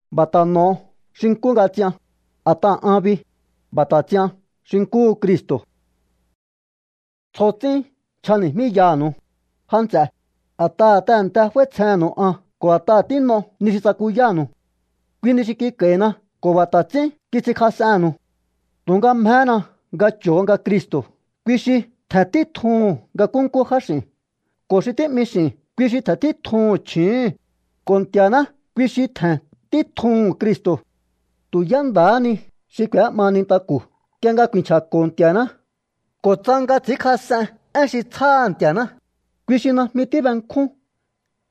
B'a̱ ta̱ n'o̱o xi nkú nga ts'ian, a̱t'aha̱ an bi, b'a̱ ta̱ ts'ian xi nkúhu Cristo̱. Tsjo ts'ín nchjani̱jmíyaha̱nu̱u, já nts'e, a̱t'aha̱ tehe̱nte f'áítsjennu̱u an ko̱ a̱t'aha̱ tín'o ni xi tsakuyánu̱u. Kui ni xi kik'a̱i̱na ko̱ b'a̱ ta̱ ts'ín kits'inkjas'ennu̱u. Tu̱nga mjehéna nga cho̱o nga Cristo̱ kui xi tje̱n títjuhu̱n nga nkúnkú jáx'i̱n, ko̱ xi tí'mi x'i̱n kui xi tje̱n títjuhu̱n chju̱úhu̱n, ko̱ Nti̱a̱ná kui xi tje̱n títjuhu̱n Cristo̱. Tu̱ yá nda̱há ni xi k'u̱é'ma nintaku̱ nk'ie nga ku̱i̱nchja̱ko̱ Nti̱a̱ná ko̱ tsa nga ts'i̱ínkjas'en én xi tsjáha̱ Nti̱a̱ná, kui xi najmi tíbenkjún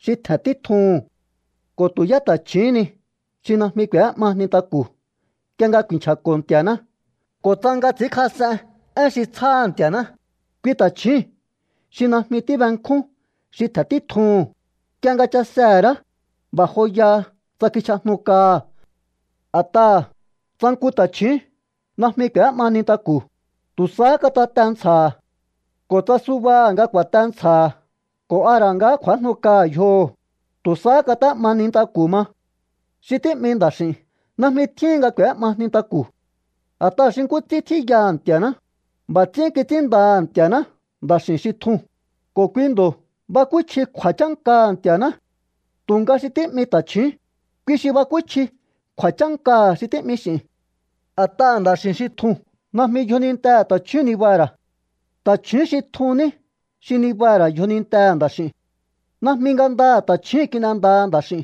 xi tje̱n títjuhu̱n. Ko̱ tu̱ yá ta̱chju̱úhún ni xi najmi k'u̱é'ma nintaku̱ nk'ie nga ku̱i̱nchja̱ko̱ Nti̱a̱ná ko̱ tsa nga ts'i̱ínkjas'en én xi tsjáha̱ Nti̱a̱ná, kui ta̱chjúu̱n xi najmi tíbenkjún xi tje̱n títjuhu̱n. Nk'ie nga chasehe̱ ra̱á, b'a̱ joyaha tsa kichj'ajnu kaha̱. A̱t'aha̱ tsa nku ta̱chju̱ún najmi k'u̱é'ma nintaku̱, tu̱ sahá katate ntsja̱ha̱. Ko̱ tsa subaha̱ nga ku̱a̱te ntsja̱ha̱ ko̱ a ra̱ nga kj'u̱ájnu kaha̱ yjoho̱, tu̱ sahá kat'é'ma nintaku̱ ma. Xi tí'mi nda̱x'i̱n najmi tjíhin nga k'u̱é'ma nintaku̱. A̱t'aha̱ xi nkú ts'ín tjíyaha Nti̱a̱ná, b'a̱ ts'ín kits'ínndaha̱ Nti̱a̱ná nda̱x'i̱n xi tjuu̱n, ko̱ kui ndo̱ bakúchji kju̱a̱chánkaha̱ Nti̱a̱ná. Tu̱nga xi tí'mi ta̱chju̱ún, kui xi bakúchji kju̱a̱chánkaha̱ xi tí'mi x'i̱n. A̱t'aha̱ nda̱x'i̱n xi tjuu̱n najmi yjonintehe̱ ta̱chjúu̱n nibaha̱ ra̱. Ta̱chju̱ún xi tjuu̱n ní xi nibaha̱ ra̱ yjonintehe̱ nda̱x'i̱u̱n. Najmi ngandaha̱ ta̱chjúu̱n kin'endaha nda̱x'i̱u̱n.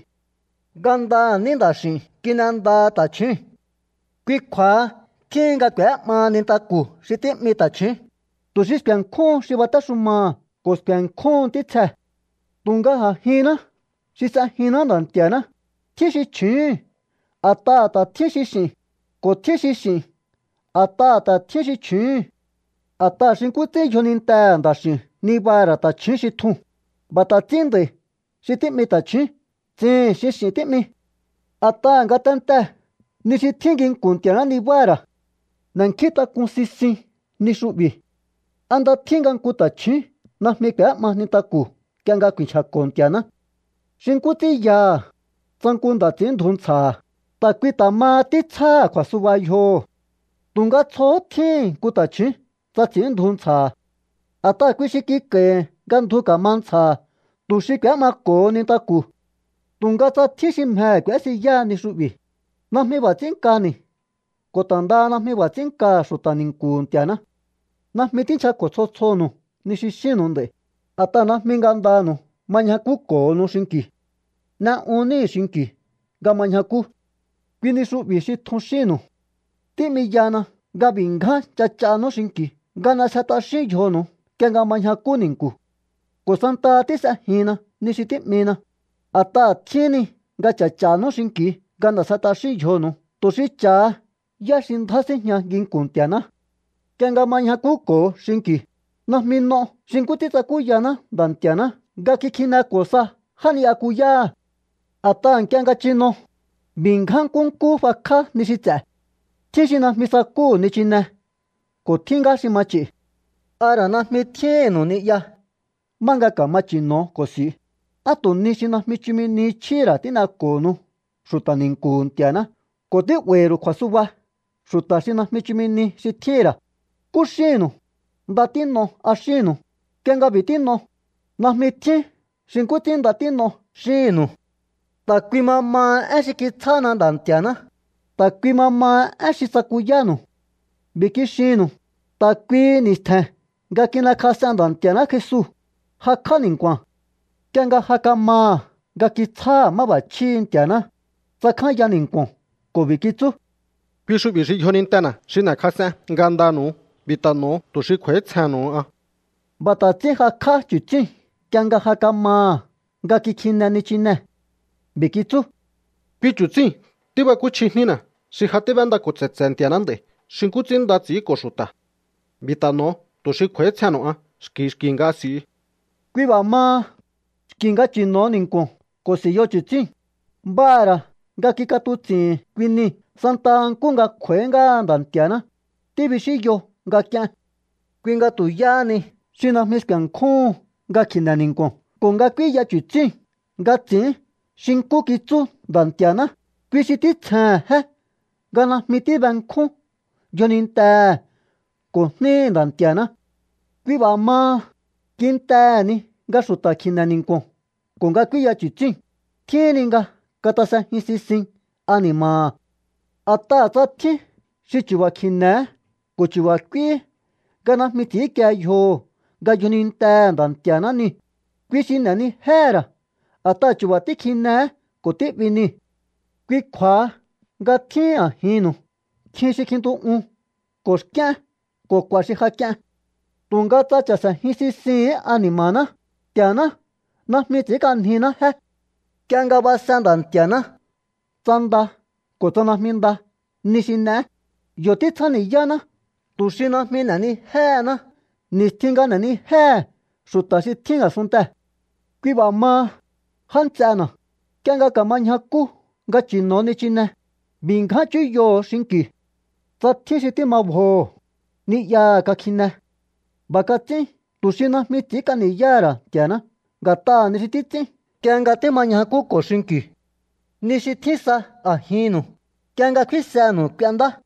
Ngandaha̱ ní nda̱x'i̱u̱n kin'endaha ta̱chjúu̱n. Kui kju̱a̱ha tjíhin nga k'u̱é'maha nintaku̱ xi tí'mi ta̱chju̱ún, tu̱ xi sku̱e̱nkjúhun xi batéxumaha̱ ko̱ sku̱e̱nkjúhun ntítsjee̱. Tu̱nga a̱jinná xi s'ejinná Nda̱ Nti̱a̱ná, tjín xi chju̱úu̱n a̱t'aha̱ ta̱ tjín xi x'i̱n, ko̱ tjín xi x'i̱n a̱t'aha̱ ta̱ tjín xi chju̱úu̱n. A̱t'aha̱ xi nkú ts'ín yjonintehe̱ nda̱x'i̱u̱n nibaha̱ ra̱ ta̱chju̱ún xi tjuu̱n, b'a̱ ta̱ ts'ín nd'a̱i̱ xi tí'mi ta̱chju̱ún tsihi̱n xi x'i̱n tí'mi. A̱t'aha̱ ngatentee̱ ni xi tjín nginku̱n Nti̱a̱ná nibáha̱ ra̱. N'e̱nkjíntak'un sisiun ni xu'bi̱. ¿A nda tjín nga nku ta̱chju̱ún najmi k'u̱é'ma nintaku̱ nk'ie nga ku̱i̱nchja̱ko̱ Nti̱a̱ná? Xi nkú ts'ín yaha̱, tsa nku nda̱ ts'i̱ínndju ntsja̱ha̱, ta̱ kui ta̱ maha títsjáha̱ kju̱a̱suba yjoho̱. Tu̱nga tsjohó tjíhi̱n nku ta̱chju̱ún tsa ts'i̱ínndju ntsja̱ha̱. A̱t'aha̱ kui xi kik'a̱i̱hi̱ nga ndju ka̱ma ntsja̱ha̱ tu̱ xi k'u̱é'mako̱ho nintaku̱. Tu̱nga tsa tjín xi mjehe̱ k'u̱ésiyáha ni xu'bi̱, najmi b'a̱ ts'ín nkani̱ ko̱ ta̱ ndaha najmi b'a̱ ts'ín nkaha̱ xu̱ta̱ ni̱nku̱hu̱ Nti̱a̱ná. Najmi tínchjako̱ tsjo tsjonu̱u ni xi xínnu̱u nd'a̱i̱, a̱t'aha̱ najmi ngandanu̱u ma ñjakúko̱honu xinki̱u. N'e'un níhi̱ xinki̱u nga ma ñjakú. Kui ni xu'bi̱ xi tjun xínnu̱u. Tí'miyana nga b'i̱ ngjáhán ch'ach'anú xinki̱u nga n'esje t'axíún yjonu̱u nk'ie nga ma ñjakú ni̱nku̱. Ko̱ santaha tís'ejinna ni xi tí'mina, a̱t'aha̱ tjíhín ni nga ch'a̱ch'a̱nú xinki̱u nga n'e̱sje t'axíún yjonu̱u tu̱ xi cha̱ha yá xi ndjá síjña nginku̱n Nti̱a̱ná. Nk'ie nga ma ñjakúko̱o xinki̱u, najmi n'o xi nkú ts'ín tsakúyaná Nda̱ Nti̱a̱ná nga kikjineko̱ sa já ni'yakuyáha̱. A̱t'aha̱ nk'ie nga chino, b'i̱ ngján nkúnkú fakj'á ni xi ts'e̱. Tjín xi najmi sakúhu̱ nichinee̱ ko̱ tjín ngá xi ma ch'i̱. ¿A ra̱ najmi tjíhínnu̱u ni'ya má nga ka̱ma chi̱no̱o ko̱ s'i̱u? ¿Á tu̱ ni xi najmi chumi ni chjíhi̱ ra̱ tín'eko̱honu xu̱ta̱ ni̱nku̱hu̱ Nti̱a̱ná ko̱ tí'ba̱i̱hi̱ ru̱u kju̱a̱suba xu̱ta̱ xi najmi chumi ni xi tjíhi̱n ra̱? ¿Nkú xínnu̱u? ¿“Nda tín'o”, a xínnu̱u? Nk'ie nga b'i̱ tín'o, najmi tjín xi nkú ts'ín “Nda tín'o” xíhi̱nnu̱u. Ta̱ kui ma maha én xi kitsjána Nda̱ Nti̱a̱ná, ta̱ kui ma maha én xi tsakuyánu̱u. B'i̱ kixinnu̱u: Ta̱ kuihi ni̱stje̱n nga kin'ekjas'en Nda̱ Nti̱a̱ná Jesu, jakj'á ni̱nku̱a̱n. Nk'ie nga ja kamaha̱ nga kitsjáha̱ máb'a̱chjíhi̱ Nti̱a̱ná, tsakjánya ni̱nku̱o̱n ko̱ b'i̱ kitsú: “Kui xu'bi̱ xi yjonintena̱ xi n'e̱kjas'en ngandanu̱u. B'i̱ ta̱ n'o̱o tu̱ xi kj'u̱a̱ítsjehe̱nnu̱u an.” B'a̱ ta̱ ts'ín jakj'á chu̱tsíu̱n nk'ie nga ja kamaha̱ nga kikjine nichinee̱. B'i̱ kitsú: “Kui chu̱tsíi̱n tíbakúchji jnína̱ xi ja tíb'éndako̱ tse̱tse̱he Nti̱a̱ná nd'a̱i̱ xi nkú ts'ín nda ts'i̱ínko̱ xu̱ta̱. B'i̱ ta̱ n'o̱o tu̱ xi kj'u̱a̱ítsjehe̱nnu̱u an xki̱ xki̱ nga s'i̱u.” Kui b'a̱ maha, xki̱ nga chi̱no̱o ni̱nku̱o̱n ko̱ s'i̱yo chu̱tsíu̱n, b'aha̱ ra̱ nga kik'atuts'i̱hi̱n kui nii̱ santa nkúhu nga kj'u̱a̱í ngáha Nda̱ Nti̱a̱ná, tíbixínyo nga k'ien. Kui nga tu̱ yáhá ni xi najmi sku̱e̱nkjúhun nga kji̱ne̱ ni̱nku̱o̱n ko̱ nga k'úíya chu̱tsíu̱n nga ts'i̱ín xi nkú kitsú Nda̱ Nti̱a̱ná, kui xi títsjehe̱n jé nga najmi tíbenkjún yjonintehe̱ ko̱ jníhi̱ Nda̱ Nti̱a̱ná. Kui b'a̱ maha, kintehe̱ ni nga xu̱ta̱ kji̱ne̱ ni̱nku̱o̱n ko̱ nga k'úíya chu̱tsíu̱n, tjíhin ni nga katasejin sisin ani̱ma̱ha̱. A̱t'aha̱ tsa tjín xi chu̱ba̱ kji̱ne̱hé ko̱ chu̱ba̱ k'úíhí nga najmi ts'i̱ínkie yjoho̱ nga yjonintehe̱ Nda̱ Nti̱a̱ná niu̱, kui xi n'e̱nijéhe̱ ra̱ a̱t'aha̱ chu̱ba̱ tíkjinehé ko̱ tí'bi niu̱. Kui kju̱a̱ha nga tjíhin a̱jinnu̱u nkjin xi kjintu'un ko̱ xk'íén ko̱ k'u̱a̱ xi ja k'ien. Tu̱nga tsa cha̱se̱jin sisihi̱ín ani̱ma̱ná, Nti̱a̱ná najmi ts'i̱ínk'anjiná jé. Nk'ie nga base Nda̱nti̱aná tsa nda ko̱ tsa najmi nda ni xi n'eé, yo̱ títsjáni̱yáná tu̱ xi najmi n'e̱nijéhená ni̱stjin nga n'e̱nijéhe̱ xu̱ta̱ xi tjín a̱sunntee̱. Kui b'a̱ maha, já nts'ena̱, nk'ie nga ka̱ma ñjakú nga chi̱no̱o nichinee̱, b'i̱ ngján chúyoho̱o xinki̱u. Tsa tjín xi tíma bjoho̱, ni'yaha̱ kakjine. B'a̱ kats'ín tu̱ xi najmi ts'i̱ínk'a ni̱yáha̱ ra̱ Nti̱a̱ná nga̱t'aha̱ ni xi títs'ín nk'ie nga tíma ñjakúko̱o xinki̱u. Ni xi tjín sa a̱jinnu̱u, nk'ie nga kfínsenu̱u k'uendá.